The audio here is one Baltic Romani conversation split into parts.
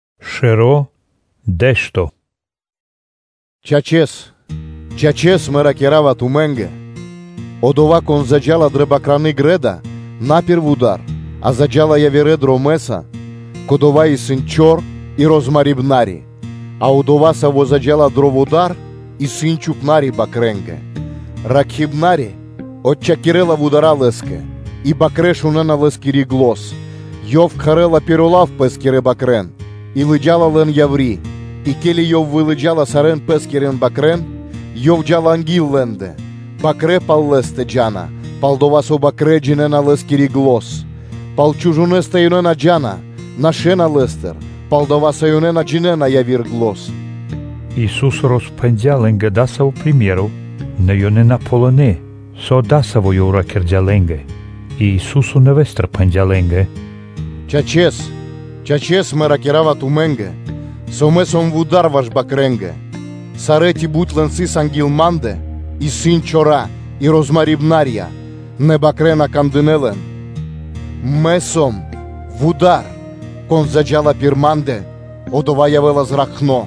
Приме́ро (Сыкаибэ́н) пал Чхупнари́стэ (Пастырёстэ) “Чачэс, чачэс, Мэ ракира́ва тумэ́нгэ: одова́, кон заджа́ла дрэ бакраны грэ́да (дво́ро) на пир вуда́р, а заджа́ла явирэ дромэ́са, кодова́ исын чор и розмарибнари; а одова́, саво́ заджа́ла дро вуда́р, исын чхупна́ри бакрэнгэ; Ракхибнари отчхакирэла вудара́ лэ́скэ, и бакрэ́ шунэ́на лэ́скири зан, ёв кхарэ́ла пиро́ лав пэ́скирэ бакрэ́н и лыджа́ла лэн яври́. И ке́ли ёв вылыджала сарэ́н пэ́скирэ бакрэ́н, ёв джа́ла анги́л лэ́ндэ; бакрэ́ пал лэ́стэ джа́на, пал-дова́ со бакрэ́ джинэ́на лэ́скири зан. Пал чужонэстэ ёнэ на джа́на, нашэ́на лэ́стыр, пал-дова́ со ёнэ на джинэ́на яви́р зан.” Ису́со роспхэндя́ лэ́нгэ дасаво приме́ро (сыкаибэ́н), нэ ёнэ на ґалынэ́, со дасаво Ёв ракирдя́ лэ́нгэ. И Ису́со нэвэ́стыр пхэндя́ лэ́нгэ: “Чачэс, чачэс Мэ ракира́ва тумэ́нгэ, со Мэ сом вуда́р ваш бакрэнгэ. Сарэ́, ци бут лэн сыс анги́л Ма́ндэ, исын чора и розмарибнарья, и бакрэ́ на кандынэ́ лэн. Мэ сом дасаво вуда́р: кон заджа́ла пир Ма́ндэ, одова́ явэ́ла зракхно,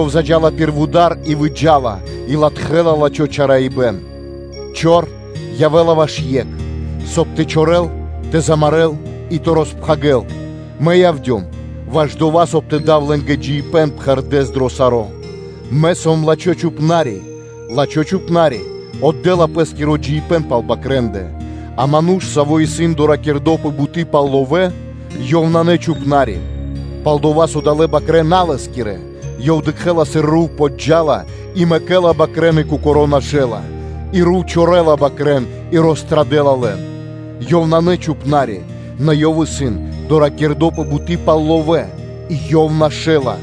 ёв заджа́ла пир вуда́р и выджа́ла, и латхэ́ла лачхо́ чараибэн. Чор явэ́ла ваш екх, соб (кай) тэ чорэл, тэ замарэ́л и тэ роспхагирэл: Мэ явдём ваш дава́, соб (кай) тэ дав лэ́нгэ джиибэ́н пхэрдэ́с дро саро́. Мэ сом лачхо́ чхупна́ри: лачхо́ чхупна́ри отдэ́ла пэ́скиро джиибэ́н пал бакрэндэ: а ману́ш, саво́ исын доракирдо пэ буты́ пал ловэ́, ёв исын на чхупна́ри, пал-дова́ со далэ́ бакрэ́ исын на лэ́скирэ, ёв дыкхэ́ла, сыр рув подджа́ла и мэкэ́ла бакрэ́н и кокоро́ нашэла, и рув чорэла бакрэ́н и рострадэла лэн. Ёв исын на чхупна́ри, нэ ёв исын доракирдо пэ буты́ пал ловэ́, и ёв нашэла,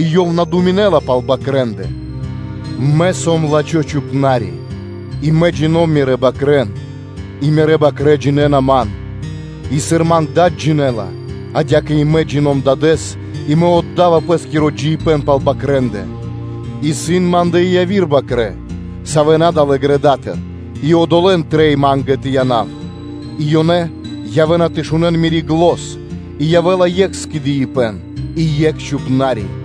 и ёв на думинэ́ла пал бакрэндэ Мэ сом лачхо́ Чхупна́ри, и Мэ джино́м Мирэ́ бакрэ́н, и Мирэ́ бакрэ́ джинэ́на Ман. И сыр Ман Дад джинэ́ла, адя́кэ и Мэ джино́м (джина́в) Дадэ́с, и Мэ отда́ва пэ́скиро джиибэ́н пал бакрэндэ. Исын Ма́ндэ и яви́р бакрэ́, савэ́ на далэ́ грэдатыр, и одолэ́н трэй Ма́нгэ тэ янав: и ёнэ явэ́на тэ шунэ́н Мири́ зан, и явэ́ла екх скэдыибэ́н и екх Чхупна́ри.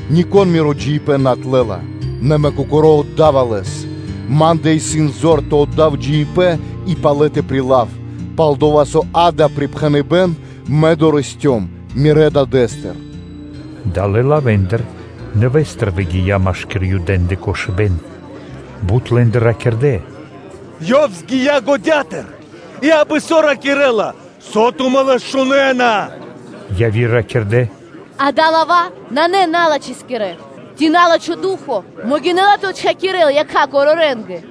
Нико́н Миро джиибэ́н на отлэла, нэ Мэ Кокоро́ отда́ва лэс: Ма́ндэ исын зор тэ отдав джиибэ́н и палэ тэ прилав; пал-дова́ со дава́ припхэныбэ́н Мэ дорэсцём Мирэ́ Дадэ́стыр.” Далэ́ лавэ́ндыр нэвэ́стыр выгия́ машки́р Юдэ́ндэ кошыбэ́н. Бут лэ́ндыр ракирдэ́: “Ёв згия годятыр и абы-со ракирэ́ла; со тумэ́ Лэс шунэ́на?” Яви́р ракирдэ́: “Ѓа́да, лава́ исын на налачхэскирэ; ци на́лачхо ду́хо (фа́но) могинэ́ла тэ отчхакурэл якха́ корорэнгэ?”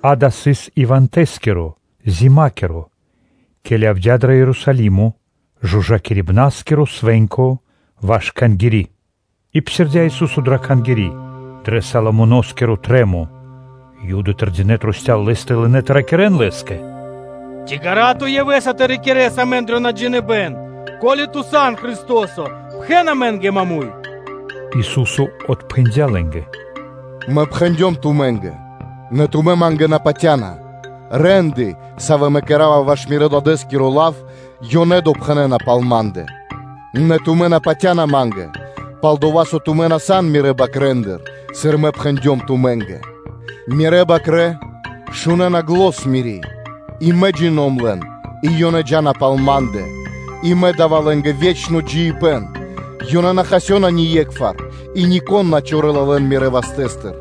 Дава́ сыс ивантэ/ивэндэ (зимакиро), ке́ли явдя́ дро Ерусалимо жужакирибнаскиро свэ́нко (Ханукка) ваш Кхангири́. И псирдя́ Ису́со дрэ Кхангири́, пир Соломоно́скиро трэ́мо. Юды тэрдинэ́ трусця́л Лэ́стэ и лынэ́ тэ ракирэ́н Лэ́скэ: “Ци ґара́ (длу́гэс) Ту явэ́са тэ рикирэс амэн дро наджиныбэн? Ко́ли Ту сан Христо́со, пхэн амэ́нгэ маму́й (прямэс)!” Ису́со отпхэндя́ лэ́нгэ: “Мэ пхэндём тумэ́нгэ, нэ тумэ́ Ма́нгэ на патя́на; рэ́нды, савэ́ Мэ кэра́ва ваш Мирэ́-Дадэ́скиро лав, – ёнэ допхэнэна пал Ма́ндэ; Нэ тумэ́ на патя́на Ма́нгэ, пал-дова́ со тумэ́ на сан Мирэ́ бакрэ́ндыр, сыр Мэ пхэндём тумэ́нгэ. Мирэ́ бакрэ́ шунэ́на зан Мири́, и Мэ джино́м (джина́в) лэн, и ёнэ джа́на пал Ма́ндэ; и Мэ да́ва лэ́нгэ ве́чно джиибэ́н, ёнэ на хасёна ние́кхвар, и нико́н на чорэла лэн Мирэ́ вастэ́стыр.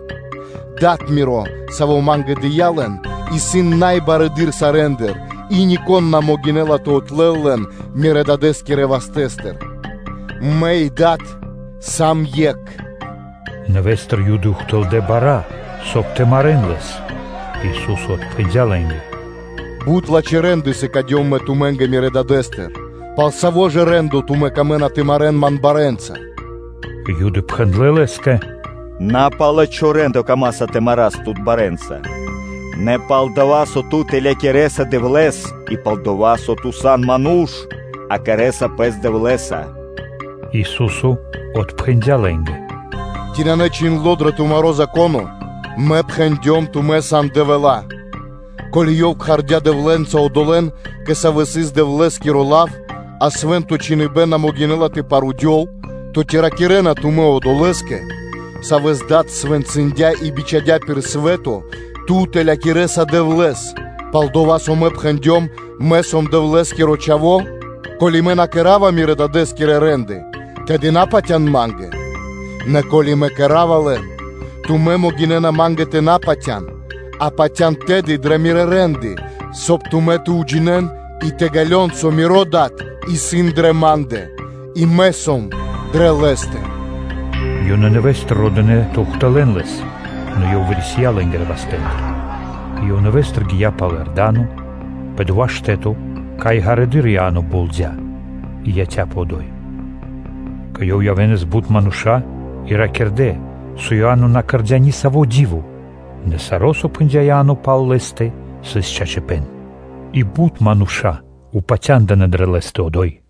Дад Миро, Саво́ Ма́нгэ дыя́ лэн, исын най барэды́р сарэ́ндыр, и нико́н на могинэ́ла тэ отлэл лэн Мирэ́-Дадэ́скирэ вастэ́стыр: Мэ и Дад сам Екх.” Нэвэ́стыр Юды ухтылдэ́ бара́, соб (кай) тэ марэ́н Лэс. Ису́со отпхэндя́ лэ́нгэ: “Бут лачхэ́ рэ́нды сыкадём Мэ тумэ́нгэ Мирэ́ Дадэ́стыр; пал саво́ ж рэ́ндо лэ́ндыр тумэ́ камэ́на тэ марэ́н Ман барэ́нца?” Юды пхэндлэ́ Лэ́скэ: “На пал лачхо́ рэ́ндо амэ камаса тэ марас Тут барэ́нца, нэ пал дова́, со Ту тэлякирэса Дэвлэ́с и пал дова́, со Ту сан ману́ш, а кэрэ́са Пэс Дэвлэ́са.” Ису́со отпхэндя́ лэ́нгэ: “Ци нанэ чхиндло́ дрэ тумаро́ Зако́но: “Мэ пхэндём: ‘Тумэ́ сан дэвэла́?’” Ко́ли Ёв кхардя́ дэвлэнца одолэ́н, кэ савэ́ сыс Дэвлэ́скиро лав, а Свэ́нто Чхиныбэ́н на могинэ́ла тэ парудёл, то ци ракирэ́на тумэ́ Одолэ́скэ, Савэс Дад свэнцындя и бичхадя́ пир свэ́то: ‘Ту тэлякирэса Дэвлэ́с,’ пал-дова́ со Мэ пхэндём: ‘Мэ сом Дэвлэ́скиро Чхаво́?’ Ко́ли Мэ на кэра́ва Мирэ́ Дадэ́скирэ рэ́нды, тэды на патя́н Ма́нгэ; нэ ко́ли Мэ кэра́ва лэн, тумэ́ могинэ́на Ма́нгэ тэ на патя́н, а патя́н тэды дрэ Мирэ́ рэ́нды, соб (кай) тумэ́ тэ джинэ́н и тэ ґалён, со Миро Дад исын дрэ Ма́ндэ, и Мэ сом дрэ Лэ́стэ.” Ёнэ нэвэ́стыр родынэ тэ ухтылэ́н Лэс, нэ Ёв вырисия лэ́нгирэ вастэ́ндыр, и Ёв нэвэ́стыр гия́ пал Иорда́но, пэ дова́ штэ́то, кай ґарэдыр Иа́но болдя, и яця́пэ одо́й. Кэ Ёв явэ́нас бут мануша́ и ракирдэ́, со Иа́но на кэрдя́ нисаво́ ди́во; нэ саро́, со пхэндя́ Иа́но пал Лэ́стэ, сыс чачипэ́н. И бут мануша́ упатя́ндынэ дрэ Лэ́стэ одо́й.